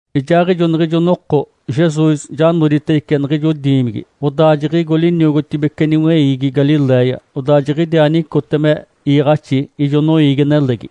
Ijaaɡ̶ijo niɡ̶ijo noko Jesus ja noditedice niɡ̶ijo diimigi, odaa jiɡ̶igo liniogotibece niweiigi Galiléia. Odaa jiɡ̶idiaa nicote me iiɡ̶axi ijo noiigi-nelegi.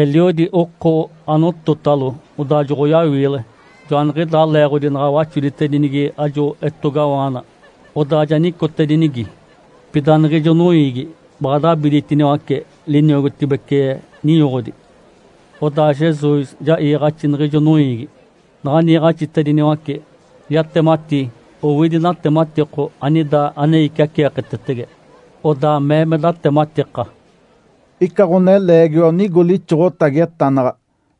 Eliodi oko anototalo, odaa joɡ̶oyawiile. Joaniɡ̶idaa leeɡ̶odi naɡ̶a waxoditedinigi ajo etogawaana, odaa ja nicotedinigi. Pida niɡ̶ijo noiigi baɡ̶a dabiditiniwace liniogotibece ninyoɡ̶odi. Odaa Jesus ja iiɡ̶axi niɡ̶ijo noiigi. Naɡ̶a niiɡ̶axitediniwace, yatemati owidi natematiko anida ane iciaceeketetege. Odaa mee me datematika, “Ica ɡ̶oneleegiwa onigo lixoɡ̶otagi etanaɡ̶a,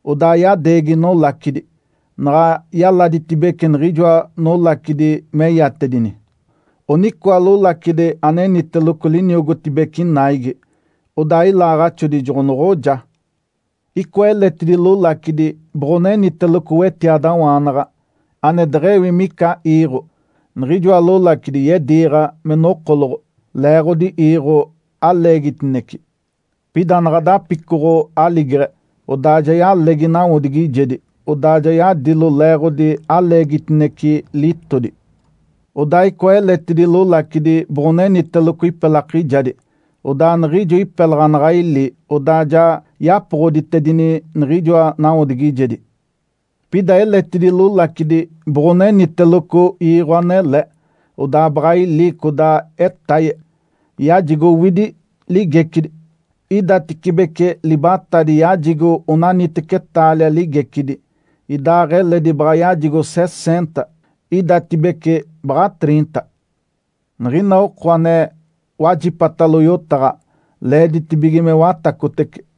odaa yadeegi nolacidi. Naɡ̶a yaladitedibece niɡ̶ijoa nolacidi meyatedini, onicoa lolacidi aneniteloco liniogotibece naigi. Odaa ilaaɡ̶axodi joɡ̶onoɡ̶oja. Icoa eletidi lolacidi boɡ̶oneniteloco wetiadawaanaɡ̶a, ane deɡ̶ewi mica iiɡ̶o. Niɡ̶ijoa lolacidi yediiɡ̶a me nokoloɡ̶o leeɡ̶odi iiɡ̶o aleegitinece. Pida naɡ̶a dapicoɡ̶o aligeɡ̶e, odaa ja yalegi nawodigijedi, odaa ja yadilo leeɡ̶odi aleegitinece litodi. Odaa icoa eletidi lolacidi boɡ̶oneniteloco ipelakijadi. Odaa niɡ̶ijo ipelaɡ̶a naɡ̶a ili, odaa ja yapoɡ̶oditedini niɡ̶ijoa nawodigijedi. Pida eletidi lolacidi boɡ̶oneniteloco iiɡ̶o anele. Odaa baɡ̶a ili codaa etaye, yajigo owidi ligecidi. Idatecibece libatadi yajigo onaniteci taalia ligecidi, idaaɡ̶eledi baɡ̶a yajigo seseenta, idatibece baɡ̶a triinta. Niɡ̶ina oko ane wajipatalo yotaɡ̶a, leeditibige me watacotece.”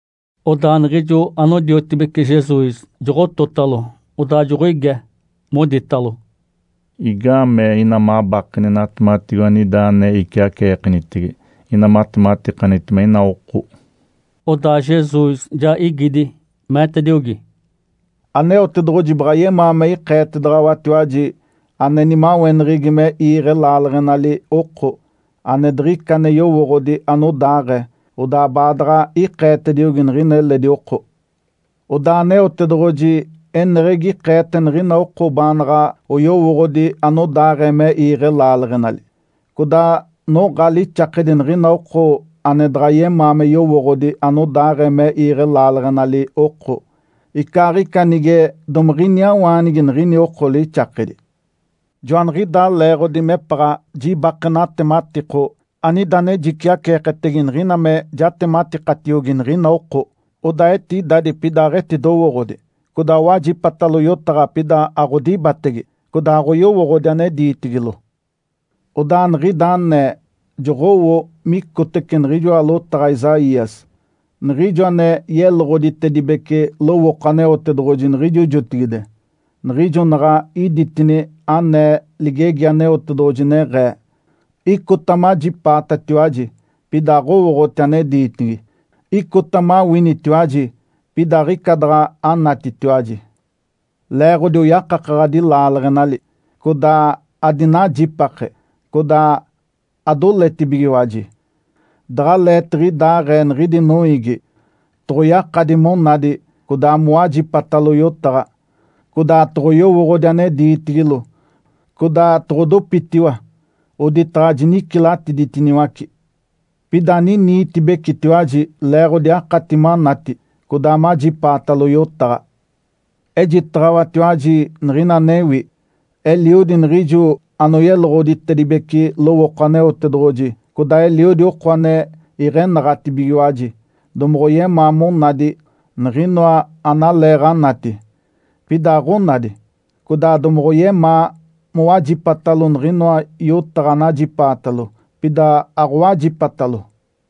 Odaa niɡ̶ijo anodiotibece Jesus joɡ̶ototalo, odaa joɡ̶oige, moditalo, “Igaamee ina mabakeni natematigo anida ane iciaceekenitege, ina matematikanitema ina oko?” Odaa Jesus ja igidi, meetediogi, “Aneotedoɡ̶oji baɡ̶a yemaa me ikeetedaɡ̶awatiwaji ane nimaweneɡ̶egi me iiɡ̶e laaleɡ̶enali oko, ane diɡ̶ica ane yowooɡ̶odi anodaaɡ̶ee. Odaa baadaɡ̶a ikeetediogi niɡ̶ina eledi oko. Odaa Aneotedoɡ̶oji eneɡ̶egi ikeete niɡ̶ina oko baanaɡ̶a oyowooɡ̶odi anodaaɡ̶ee me iiɡ̶e laaleɡ̶enali. Codaa noɡ̶a lixakedi niɡ̶ina oko ane daɡ̶a yemaa me yowooɡ̶odi anodaaɡ̶ee me iiɡ̶e laaleɡ̶enali oko, icaaɡ̶ica nige domiɡ̶iniawaanigi niɡ̶ini oko lixakedi. Joaniɡ̶idaa leeɡ̶odi mepaɡ̶a jibake natematiko anida ane jiciaceeketege niɡ̶ina me jatematikatiogi niɡ̶ina oko. Odaa etidadi pida aɡ̶etidowooɡ̶odi. Codaa owajipatalo yotaɡ̶a, pida aɡ̶odibatege, codaa aɡ̶oyowooɡ̶odi ane diitigilo. Odaa niɡ̶ida anee joɡ̶owo micotece niɡ̶ijoa lotaɡ̶a Isaías, niɡ̶ijo ane yeloɡ̶oditedibece lowooko Aneotedoɡ̶oji niɡ̶ijo jotigide, niɡ̶ijo naɡ̶a iditini ane ligegi Aneotedoɡ̶oji, neɡ̶ee, ‘Icota majipaatatiwaji, pida aɡ̶owooɡ̶oti ane diitigi. Icota mawinitiwaji, pida aɡ̶ica daɡ̶a anatitiwaji. Leeɡ̶odi oyakakaɡ̶adi laaleɡ̶enali, codaa adinajipake, codaa adoletibigiwaji. Daɡ̶aleetiɡ̶idaaɡ̶ee niɡ̶idi noiigi, toɡ̶oyakadi monadi, codaa mowajipatalo yotaɡ̶a, codaa toɡ̶oyowooɡ̶odi ane diitigilo, codaa toɡ̶odopitiwa oditaɡ̶a jinicilatiditiniwaci.’ Pida aniniitibecetiwaji leeɡ̶odi akati manati, codaa majipaatalo yotaɡ̶a. Ejitaɡ̶awatiwaji niɡ̶ina anewi. Eliodi niɡ̶ijo anoyeloɡ̶oditedibece lowooko Aneotedoɡ̶oji codaa eliodi oko ane iɡ̶enaɡ̶atibigiwaji domoɡ̶oyemaa monadi niɡ̶inoa analeeɡ̶anati, pida aɡ̶onadi, codaa domoɡ̶oyemaa mowajipatalo niɡ̶inoa yotaɡ̶a anajipaatalo, pida aɡ̶owajipatalo.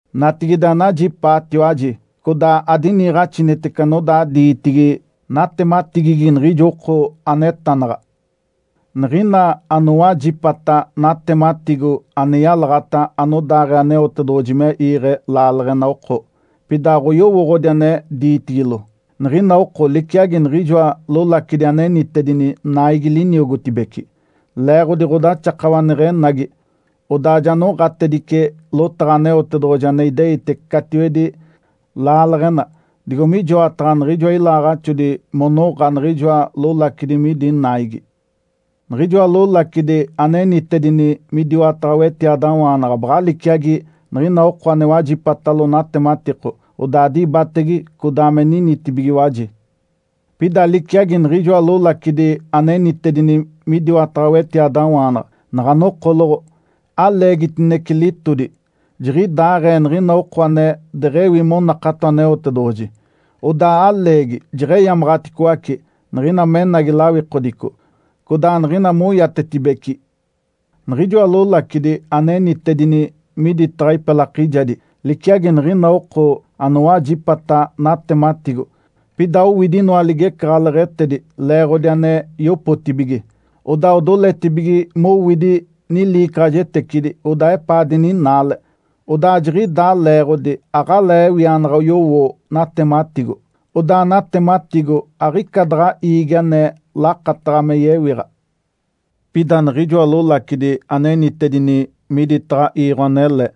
Natigide anajipaatiwaji, codaa adiniiɡ̶axinitece anodaa diitigi natematigigi niɡ̶ijo oko anetanaɡ̶a. Niɡ̶ina anowajipata natematigo ane yalaɡ̶ata anodaaɡ̶ee Aneotedoɡ̶oji me iiɡ̶e laaleɡ̶ena oko, pida aɡ̶oyowooɡ̶odi ane diitigilo, niɡ̶ina oko liciagi niɡ̶ijoa lolacidi anenitedini naigi liniogotibece. Leeɡ̶odi ɡ̶odaxakawa neɡ̶enagi, odaa ja noɡ̶atedice lotaɡ̶a Aneotedoɡ̶oji ane ideite catiwedi laaleɡ̶ena digo mijoataɡ̶a niɡ̶ijoa ilaaɡ̶axodi monoɡ̶a niɡ̶ijoa lolacidi midi naigi. Niɡ̶ijoa lolacidi anenitedini midiwataɡ̶a wetiadawaanaɡ̶a baɡ̶a liciagi niɡ̶ina oko ane wajipatalo natematiko, odaa dibatege, codaa me ninitibigiwaji. Pida liciagi niɡ̶ijoa lolacidi anenitedini midiwataɡ̶a wetiadawaanaɡ̶a naɡ̶a nokoloɡ̶o aleegitinece litodi, jiɡ̶idaaɡ̶ee niɡ̶ina oko ane deɡ̶ewi monakato Aneotedoɡ̶oji, odaa aleegi jeɡ̶eyamaɡ̶aticoace niɡ̶ina menagi lawikodico, codaa niɡ̶ina moiatetibeci. Niɡ̶ijoa lolacidi anenitedini miditaɡ̶a ipelakijadi, liciagi niɡ̶ina oko anowajipata natematigo, pida owidi inoa ligecaɡ̶aleɡ̶etedi leeɡ̶odi ane yopotibige, odaa odoletibige mowidi niliicaɡ̶ajetecidi, odaa epaa dininaale. Odaa jiɡ̶idaa leeɡ̶odi aɡ̶alee ewianaɡ̶a oyowo natematigo, odaa natematigo aɡ̶ica daɡ̶a iigi ane lakataɡ̶a me yewiɡ̶a. Pida niɡ̶ijoa lolacidi anenitedini miditaɡ̶a iiɡ̶o anele,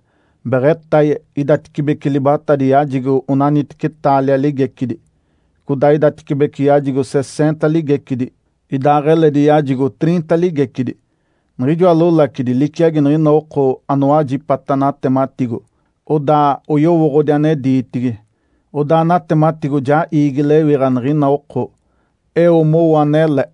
beɡ̶etaye, idatecibece libatadi yajigo onaniteci taalia ligecidi, codaa idatecibece yajigo seseenta ligecidi, idaaɡ̶eledi yajigo triinta ligecidi. Niɡ̶ijoa lolacidi liciagi niɡ̶ina oko anowajipata natematigo, odaa oyowooɡ̶odi ane diitigi. Odaa natematigo ja iigi lewiɡ̶a niɡ̶ina oko eo mowo anele.”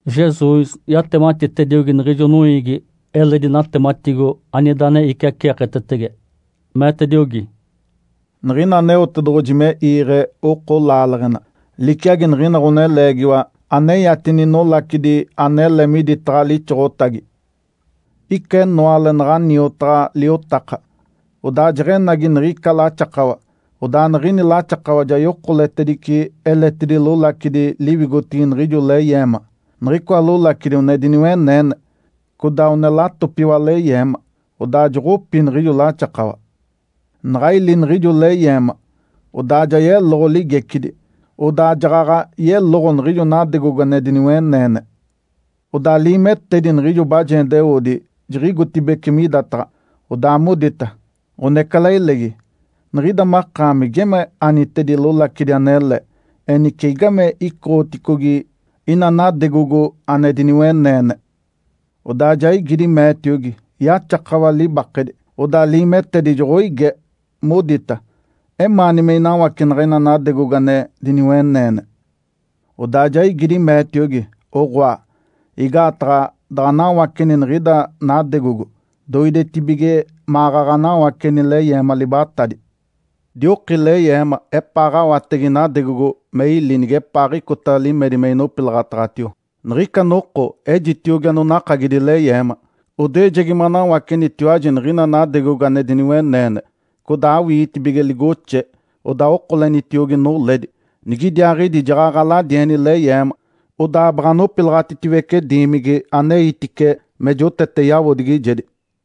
Jesus yatematitediogi niɡ̶ijo noiigi eledi natematigo anida ane iciaceeketetege, meetediogi, “Niɡ̶ina Aneotedoɡ̶oji me iiɡ̶e oko laaleɡ̶ena, liciagi niɡ̶ina ɡ̶oneleegiwa aneyatini nolacidi anele miditaɡ̶a lixoɡ̶otagi. Ica enoale naɡ̶a niotaɡ̶a liotaka, odaa jeɡ̶enagi niɡ̶ica laxakawa. Odaa niɡ̶ini laxakawa ja yokoletedice eletidi lolacidi liwigotigi niɡ̶ijo leyeema. Niɡ̶icoa lolacidi one diniweneene, codaa one latopiwa leyeema. Odaa joɡ̶opi niɡ̶ijo laxakawa. Naɡ̶a ili niɡ̶ijo leyeema, odaa ja yeloɡ̶o ligecidi. Odaa jaɡ̶aɡ̶a yeloɡ̶o niɡ̶ijo nadegogo ane diniweneene. Odaa liimetedi niɡ̶ijo bajendeoodi jiɡ̶igotibeci midataɡ̶a, odaa modita, ‘Ǥonecalailegi, niɡ̶ida makaami geme anitedi lolacidi anele. Enice, igame icoɡ̶oticogi ina nadegogo ane diniweneene?’ Odaa ja igidi, meetiogi, ‘Yaxakawa libakedi.’ Odaa liimetedi joɡ̶oige, modita, ‘Emaani me inawacenaɡ̶a ina nadegogo ane diniweneene?’ Odaa ja igidi, meetiogi, ‘Oɡ̶oa! Igaataɡ̶a daɡ̶a anawaceni niɡ̶ida nadegogo, doidetibige maɡ̶aɡ̶a anawaceni leyeema libatadi. Dioki leyeema epaaɡ̶awatege nadegogo me ili nigepaaɡ̶icota limedi me inopilaɡ̶ataɡ̶atio. Niɡ̶ica noko, ejitiogi anonakagidi leyeema, “Odoejegi manawacenitiwaji niɡ̶ina nadegogo ane diniweneene, codaa awiitibige ligoxe, odaa okolenitiogi noledi. Nigidiaaɡ̶idi jaɡ̶aɡ̶a aladieni leyeema, odaa baɡ̶a anopilaɡ̶atitiwece diimigi aneitice me jotete yawodigijedi.”’”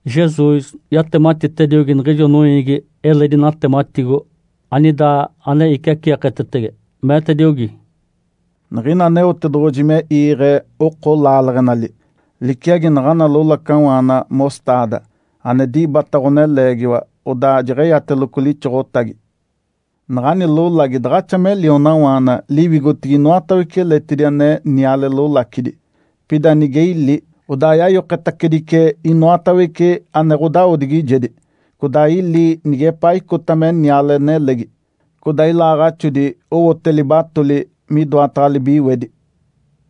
Jesus yatematitediogi niɡ̶ijo noiigi eledi natematigo anida ane iciaceeketetege, meetediogi, “Niɡ̶ina Aneotedoɡ̶oji me iiɡ̶e oko laaleɡ̶enali, liciagi naɡ̶ana lolacawaana ‘mostaada’ ane dibata ɡ̶oneleegiwa, odaa jeɡ̶eyateloco lixoɡ̶otagi. Naɡ̶ani lolagi daɡ̶axa me lionawaana liwigotigi inoatawece eletidi ane niale lolacidi. Pida nige ili, odaa yayoketacedice inoatawece ane ɡ̶odawodigijedi, codaa ili nigepaa icota me niale nelegi. Codaa ilaaɡ̶axodi owote libatoli midoataɡ̶a libiwedi.”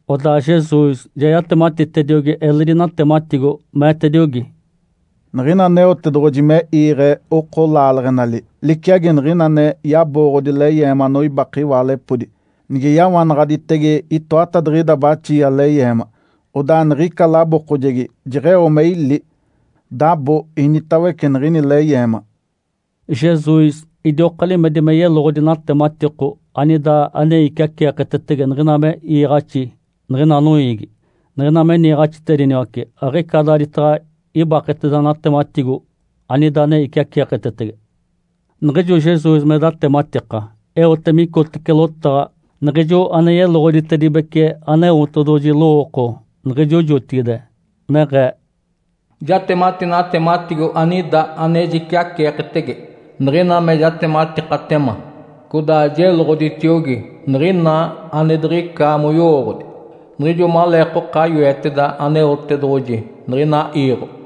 Odaa Jesus ja yatematitediogi eledi natematigo, meetediogi, “Niɡ̶ina Aneotedoɡ̶oji me iiɡ̶e oko laaleɡ̶enali, liciagi niɡ̶ina ane yabooɡ̶odi leyeema anoibake iwaalepodi. Nige yawanaɡ̶aditege itoatadiɡ̶ida baxia leyeema, odaa niɡ̶ica labookojegi jeɡ̶eo me ili, dabo initawece niɡ̶ini leyeema.” Jesus idioka limedi me yeloɡ̶odi natematiko anida ane iciaceeketetege niɡ̶ina me iiɡ̶axi niɡ̶ina noiigi. Niɡ̶ina me niiɡ̶axitediniwace, aɡ̶ica daaditaɡ̶a ibaketeda natematigo anida ane iciaceeketetege. Niɡ̶ijo Jesus me datematika, eote micotece lotaɡ̶a niɡ̶ijo ane yeloɡ̶oditedibece Aneotedoɡ̶oji lowooko niɡ̶ijo jotigide neɡ̶ee, “Jatemati natematigo anida ane jiciaceeketege, niɡ̶ina me jatematikatema. Codaa jeloɡ̶oditiogi niɡ̶ina ane diɡ̶ica moyowooɡ̶odi niɡ̶ijo maleekoka yoeteda Aneotedoɡ̶oji niɡ̶ina iiɡ̶o.”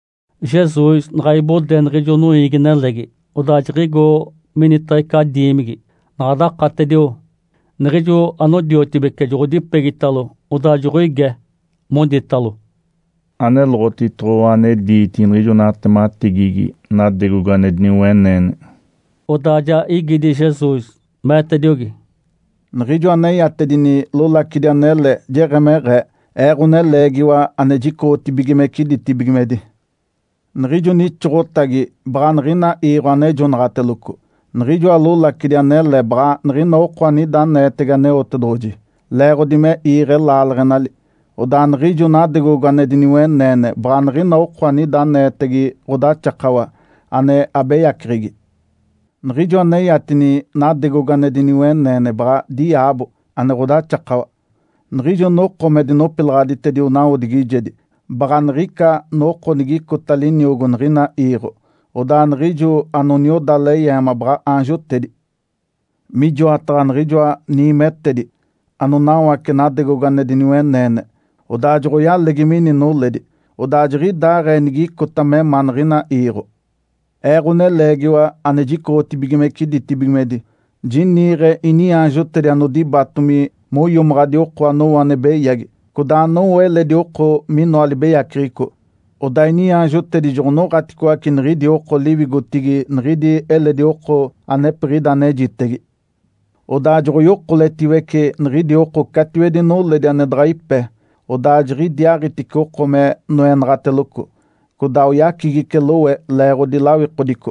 Jesus naɡ̶a ibode niɡ̶ijo noiigi-nelegi, odaa jiɡ̶igo minitaɡ̶a ica diimigi. Naɡ̶a dakatedio, niɡ̶ijo anodiotibece joɡ̶odipegitalo, odaa joɡ̶oige, moditalo, “Aneloɡ̶otitoɡ̶owa ane diitigi niɡ̶ijo natematigigi nadegogo ane diniweneene.” Odaa ja igidi Jesus, meetediogi, “Niɡ̶ijo aneyatedini lolacidi anele jeɡ̶emeɡ̶ee, Ee, Ǥoneleegiwa ane jicoɡ̶otibigimece ditibigimedi. Niɡ̶ijo nixoɡ̶otagi baɡ̶a niɡ̶ina iiɡ̶o anejonaɡ̶ateloco. Niɡ̶ijoa lolacidi anele baɡ̶a niɡ̶ina oko anida aneetege Aneotedoɡ̶oji, leeɡ̶odi me iiɡ̶e laaleɡ̶enali. Odaa niɡ̶ijo nadegogo ane diniweneene baɡ̶a niɡ̶ina oko anida aneetege ɡ̶odaxakawa, ane abeyaceɡ̶egi. Niɡ̶ijo aneyatini nadegogo ane diniweneene baɡ̶a diaabo, ane ɡ̶odaxakawa. Niɡ̶ijo noko me dinopilaɡ̶aditedio nawodigijedi baɡ̶a niɡ̶ica noko nigicota liniogo niɡ̶ina iiɡ̶o. Odaa niɡ̶ijo anonioda leyeema baɡ̶a aanjotedi. Mijoataɡ̶a niɡ̶ijoa niimetedi anonawace nadegogo ane diniweneene, odaa joɡ̶oyalegi mini noledi, odaa jiɡ̶idaaɡ̶ee nigicota me ma niɡ̶ina iiɡ̶o. Ee, Ǥoneleegiwa ane jicoɡ̶otibigimece ditibigimedi, jiniiɡ̶e iniaanjotedi anodibatomi moiomaɡ̶adi oko anowo ane beyagi, codaa anowo eledi oko minoa libeyaceɡ̶eco. Odaa iniaanjotedi joɡ̶onoɡ̶aticoace niɡ̶idi oko liwigotigi niɡ̶idi eledi oko anepiɡ̶ida anejitege. Odaa joɡ̶oyokoletiwece niɡ̶idi oko catiwedi noledi ane daɡ̶a ipe. Odaa jiɡ̶idiaaɡ̶itice oko me noenaɡ̶ateloco, codaa oyacigice lowe leeɡ̶odi lawikodico.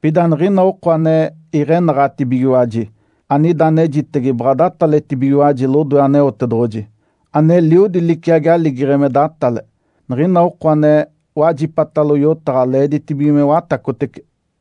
Pida niɡ̶ina oko ane iɡ̶enaɡ̶atibigiwaji anida anejitege baɡ̶a dataletibigiwaji lodoe Aneotedoɡ̶oji, ane Eliodi, liciagi aligeɡ̶e me datale. Niɡ̶ina oko ane wajipatalo yotaɡ̶a, leeditibige me watacotece!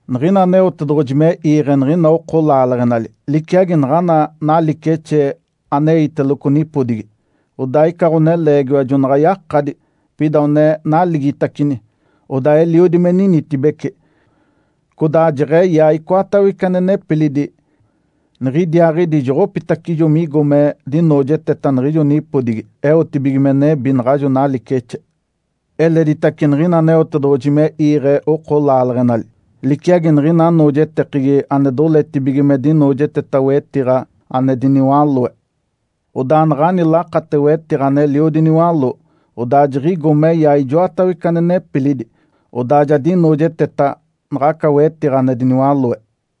Niɡ̶ina Aneotedoɡ̶oji me iiɡ̶e niɡ̶ina oko laaleɡ̶enali, liciagi naɡ̶ana nalicexe aneiteloco nipodigi. Odaa ica ɡ̶oneleegiwa jona yakadi, pida one naligitacini. Odaa eliodi me ninitibece, codaa jeɡ̶eyaa icoatawece ane nepilidi, niɡ̶idiaaɡ̶idi joɡ̶opitacijo migo me dinoojeteta niɡ̶ijo nipodigi eotibige me nebi naɡ̶ajo nalicexe. Eleditace niɡ̶ina Aneotedoɡ̶oji me iiɡ̶e oko laaleɡ̶enali, liciagi niɡ̶ina anoojetekegi ane doletibige me dinoojeteta wetiɡ̶a ane diniwaloe. Odaa naɡ̶ani lakate wetiɡ̶a aneliodi niwaló, odaa jiɡ̶igo meyaa ijoatawece ane nepilidi. Odaa ja dinoojeteta naɡ̶aca wetiɡ̶a ane diniwaloe.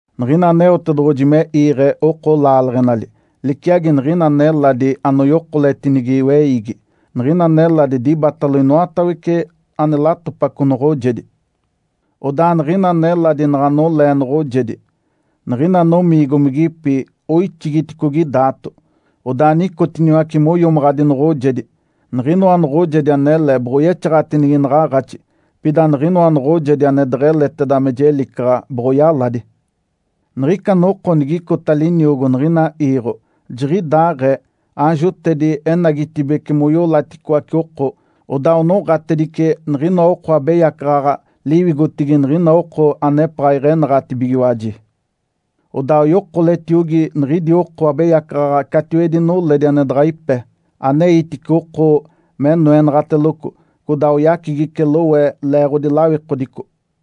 Niɡ̶ina Aneotedoɡ̶oji me iiɡ̶e oko laaleɡ̶enali, liciagi niɡ̶ina neladi anoyokoletinigi weiigi. Niɡ̶ina neladi dibatalo inoatawece ane latopaco noɡ̶ojedi. Odaa niɡ̶ina neladi naɡ̶a nolee noɡ̶ojedi, niɡ̶ina nomiigomigipi oixigiticogi daato, odaa nicotiniwace moiomaɡ̶adi noɡ̶ojedi. Niɡ̶inoa noɡ̶ojedi anele boɡ̶oyexaɡ̶atinigi naɡ̶aaɡ̶axi, pida niɡ̶inoa noɡ̶ojedi ane deɡ̶eleteda me jelicaɡ̶a boɡ̶oyaladi. Niɡ̶ica noko nigicota liniogo niɡ̶ina iiɡ̶o, jiɡ̶idaaɡ̶ee. Aanjotedi enagitibeci, moiolaticoace oko, odaa onoɡ̶atedice niɡ̶inoa oko abeyacaɡ̶aɡ̶a liwigotigi niɡ̶ina oko anepaɡ̶a iɡ̶enaɡ̶atibigiwaji. Odaa oyokoletiogi niɡ̶idi oko abeyacaɡ̶aɡ̶a catiwedi noledi ane daɡ̶a ipe. Aneitice oko me noenaɡ̶ateloco, codaa oyacigice lowe leeɡ̶odi lawikodico.”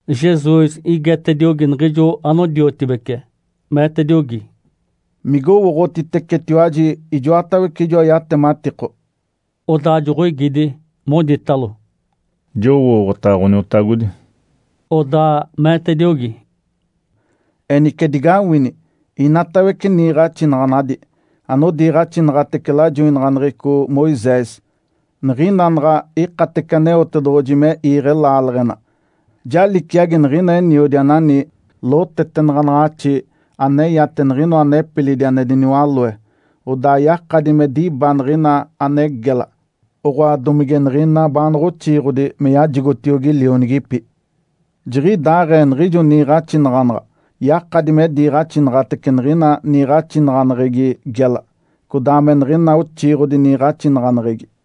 Jesus igetediogi niɡ̶ijo anodiotibece, meetediogi, “Migowooɡ̶otitecetiwaji ijoatawece ijoa yatematiko?” Odaa joɡ̶oigidi, moditalo, “Jowooɡ̶otaɡ̶a, Ǥoniotagodi”. Odaa meetediogi, “Enice digawini! Inatawece niiɡ̶axinaɡ̶anadi anodiiɡ̶axinaɡ̶atece lajoinaɡ̶aneɡ̶eco Moisés, niɡ̶ina naɡ̶a ikatece Aneotedoɡ̶oji me iiɡ̶e laaleɡ̶ena, ja liciagi niɡ̶ina eniodi anani lotetenaɡ̶anaɡ̶axi aneyate niɡ̶inoa nepilidi ane diniwaloe, odaa yakadi me diba niɡ̶ina ane gela, oɡ̶oa, domige niɡ̶ina baanaɡ̶a oxiiɡ̶odi, me yajigotiogi lionigipi. Jiɡ̶idaaɡ̶ee niɡ̶ijo niiɡ̶axinaɡ̶anaɡ̶a yakadi me diiɡ̶axinaɡ̶atece niɡ̶ina niiɡ̶axinaɡ̶aneɡ̶egi gela, codaa me niɡ̶ina oxiiɡ̶odi niiɡ̶axinaɡ̶aneɡ̶egi.”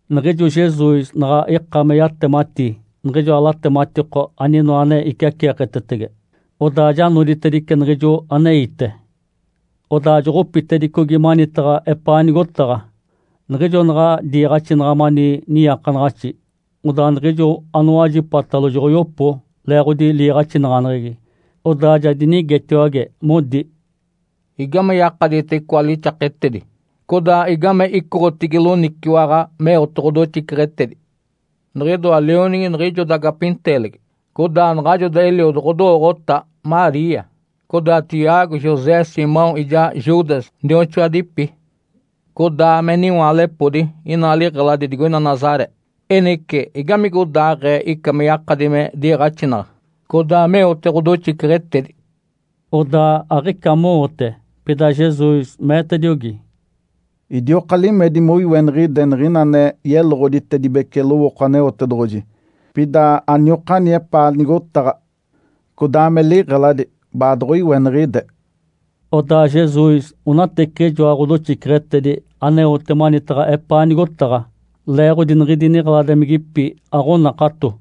Niɡ̶ijo Jesus naɡ̶a ika me yatemati niɡ̶ijoa latematiko aninoa ane iciaceeketege, odaa ja noditedice niɡ̶ijo aneite. Odaa joɡ̶opitedicogi manitaɡ̶a epaa nigotaɡ̶a. Niɡ̶ijo naɡ̶a diiɡ̶axinaɡ̶a mani niiakanaɡ̶axi, odaa niɡ̶ijo anowajipatalo joɡ̶oyopo leeɡ̶odi liiɡ̶axinaɡ̶aneɡ̶egi. Odaa ja dinigetiwage, modi, “Igame yakadite icoa lixaketedi? Codaa igame icoɡ̶otigi loniciwaɡ̶a meote ɡ̶odoxiceɡ̶etedi? Niɡ̶idoa lionigi niɡ̶ijoda gapinteelegi. Codaa naɡ̶ajoda eliodo ɡ̶odowooɡ̶ota, Maria. Codaa Tiago, José, Simão ijaa Judas nioxoadipi. Codaa me niwaalepodi inaa liɡ̶eladi digoina Nazaré. Enice, igamigodaaɡ̶ee ica me yakadi me diiɡ̶axinaɡ̶a, codaa meote ɡ̶odoxiceɡ̶etedi?” Odaa aɡ̶ica mowote. Pida Jesus meetediogi, “Idioka limedi moiweniɡ̶ide niɡ̶ina ane yeloɡ̶oditedibece lowooko Aneotedoɡ̶oji. Pida aniokani epaa nigotaɡ̶a codaa me liɡ̶eladi, baadoɡ̶oiweniɡ̶ide.” Odaa Jesus onateciɡ̶ijoa ɡ̶odoxiceɡ̶etedi aneote manitaɡ̶a epaa nigotaɡ̶a, leeɡ̶odi niɡ̶idi niɡ̶eladimigipi aɡ̶onakato.